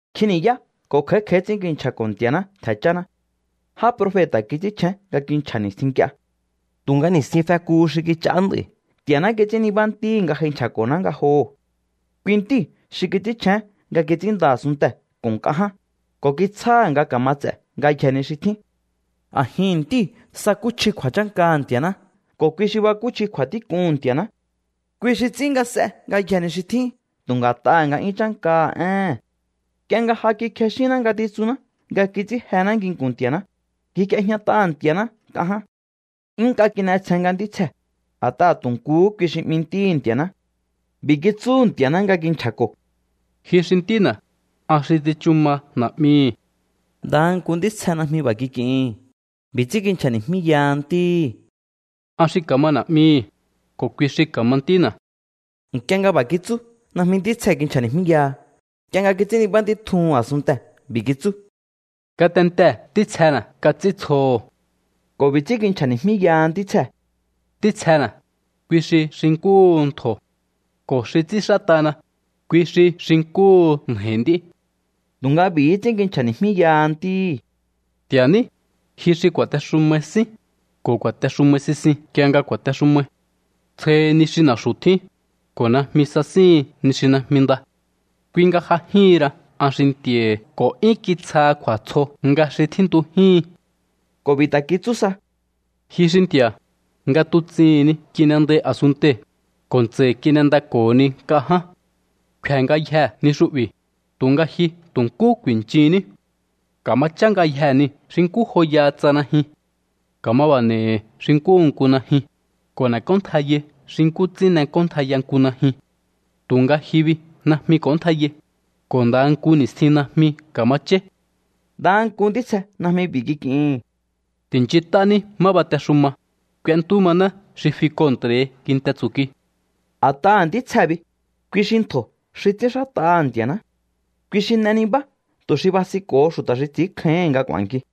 Nkjin ni̱yá ko̱ kj'a̱í kj'a̱í ts'ín kinchja̱ko̱ Nti̱a̱ná ntje̱ cháná. Já profeta̱ kits'ínchjén nga kinchja̱ ni̱stjin nk'ie. Tu̱nga ni̱stjin fekuhu xi kich'aá nd'a̱i̱ Nti̱a̱ná kits'ín nibá Ntíhi̱ nga j'ai nchja̱ko̱ná ngajoho̱. Kui Ntíu̱ xi kits'ínchjén nga kits'ínnda a̱sunntee̱ ko̱ nk'a ján, ko̱ kitsjáha̱ nga ka̱ma ts'e̱ ngayjee̱ ni xi tjín. A̱jihi̱n Ntíu̱ sakúchji kju̱a̱chánkaha̱ Nti̱a̱ná ko̱ kui xi bakúchji kju̱a̱tík'uhu̱n Nti̱a̱ná. Kui xi ts'ín nga s'e ngayjee̱ ni xi tjín tu̱ nga̱t'aha̱ nga'yún chánkaha̱ éhe̱n. Nk'ie nga ja kikjexínná ngatitsunná nga kits'ín jená nginku̱n Nti̱a̱ná, ngjik'iejñat'aha̱ Nti̱a̱ná nk'a ján. 'Yún nk'a kin'etsjen nga ntítsjee̱, a̱t'aha̱ tu̱ nkuhú kui xi 'mi Ntíhi̱ Nti̱a̱ná. B'i̱ kitsúhu̱ Nti̱a̱ná nga kinchja̱ko̱: Ji xi Ntína̱, an xi tsichu ma Na̱'mihi̱. Ndaha nku ntítsje najmi b'a̱ kik'ihi̱n. B'i̱ ts'ín kinchja̱ni̱jmíyaha Ntíhi̱: An xi ka̱ma Na̱'mihi, ko̱ kui xi ka̱ma Ntína̱. Nk'ie nga b'a̱ kitsú, najmi ntítsjee̱ kinchja̱ni̱jmíyaha. Nk'ie nga kits'ín nibá Ntí tjuhu̱n a̱sunntee̱, b'i̱ kitsú: Ngatentee̱ ntítsjena̱ kats'íntsjoho̱. Ko̱ b'i̱ ts'ín kinchja̱ni̱jmíyaha ntítsjee̱: Ntítsjena̱, kui xi xi nkúhu ntjo̱. Ko̱ xi ts'ínxát'ana, kui xi xi nkúhu nja̱i̱ nd'í. Tu̱nga b'i̱hí ts'ín kinchja̱ni̱jmíyaha Ntíhi̱: Nti̱a̱ ní, ji xi ku̱a̱texumai sín, ko̱ ku̱a̱texumai sisin nk'ie nga ku̱a̱texumai. Tsjohi ni xi na̱xu̱ tjín, ko̱ najmi sasíhin ni xi najmi nda. Kui nga j'ajíhin ra an xi Nti̱a̱hi̱, ko̱ 'yún kitsjaha kju̱a̱tsjo nga xi tjíntujíhin. Ko̱ b'i̱ ta̱ kitsú sa: Ji xi Nti̱a̱, nga tuts'ihi̱n ni kin'endai a̱sunntei̱, ko̱ ntsa̱i̱ kin'endako̱honi nk'a ján. Kfe̱ ngayjee̱ ni xu'bi̱, tu̱nga ji tu̱ nkú ku̱i̱nchunní. Ka̱ma chá ngayjee̱ niu̱ xi nkú joyaha tsa najyun. Ka̱ma b'a̱ n'e̱i̱hi̱ xi nkúhu nku najyun, ko̱ n'e̱k'óntjaiyai xi nkú ts'ín n'ek'óntjaiya nku najyun. Tu̱nga ji bi najmi k'o̱óntjaiyai, ko̱ ndaha nku ni̱stjin najmi ka̱ma cháí. Ndaha nku ntítsje najmi b'i̱ kik'ihi̱n: Ti̱nchint'ání má batexuma, k'uentú maná xi fi kontra̱hi kinte tsu̱kui. A̱t'aha̱ ntítsjee̱ bi, kui xi ntjo̱ xi ts'ínxát'aha̱ Nti̱a̱ná. Kui xi n'e nibá tu̱ xi basinko̱ho xu̱ta̱ xi ts'i̱ínkjáíhi̱n nga k'u̱a̱nki.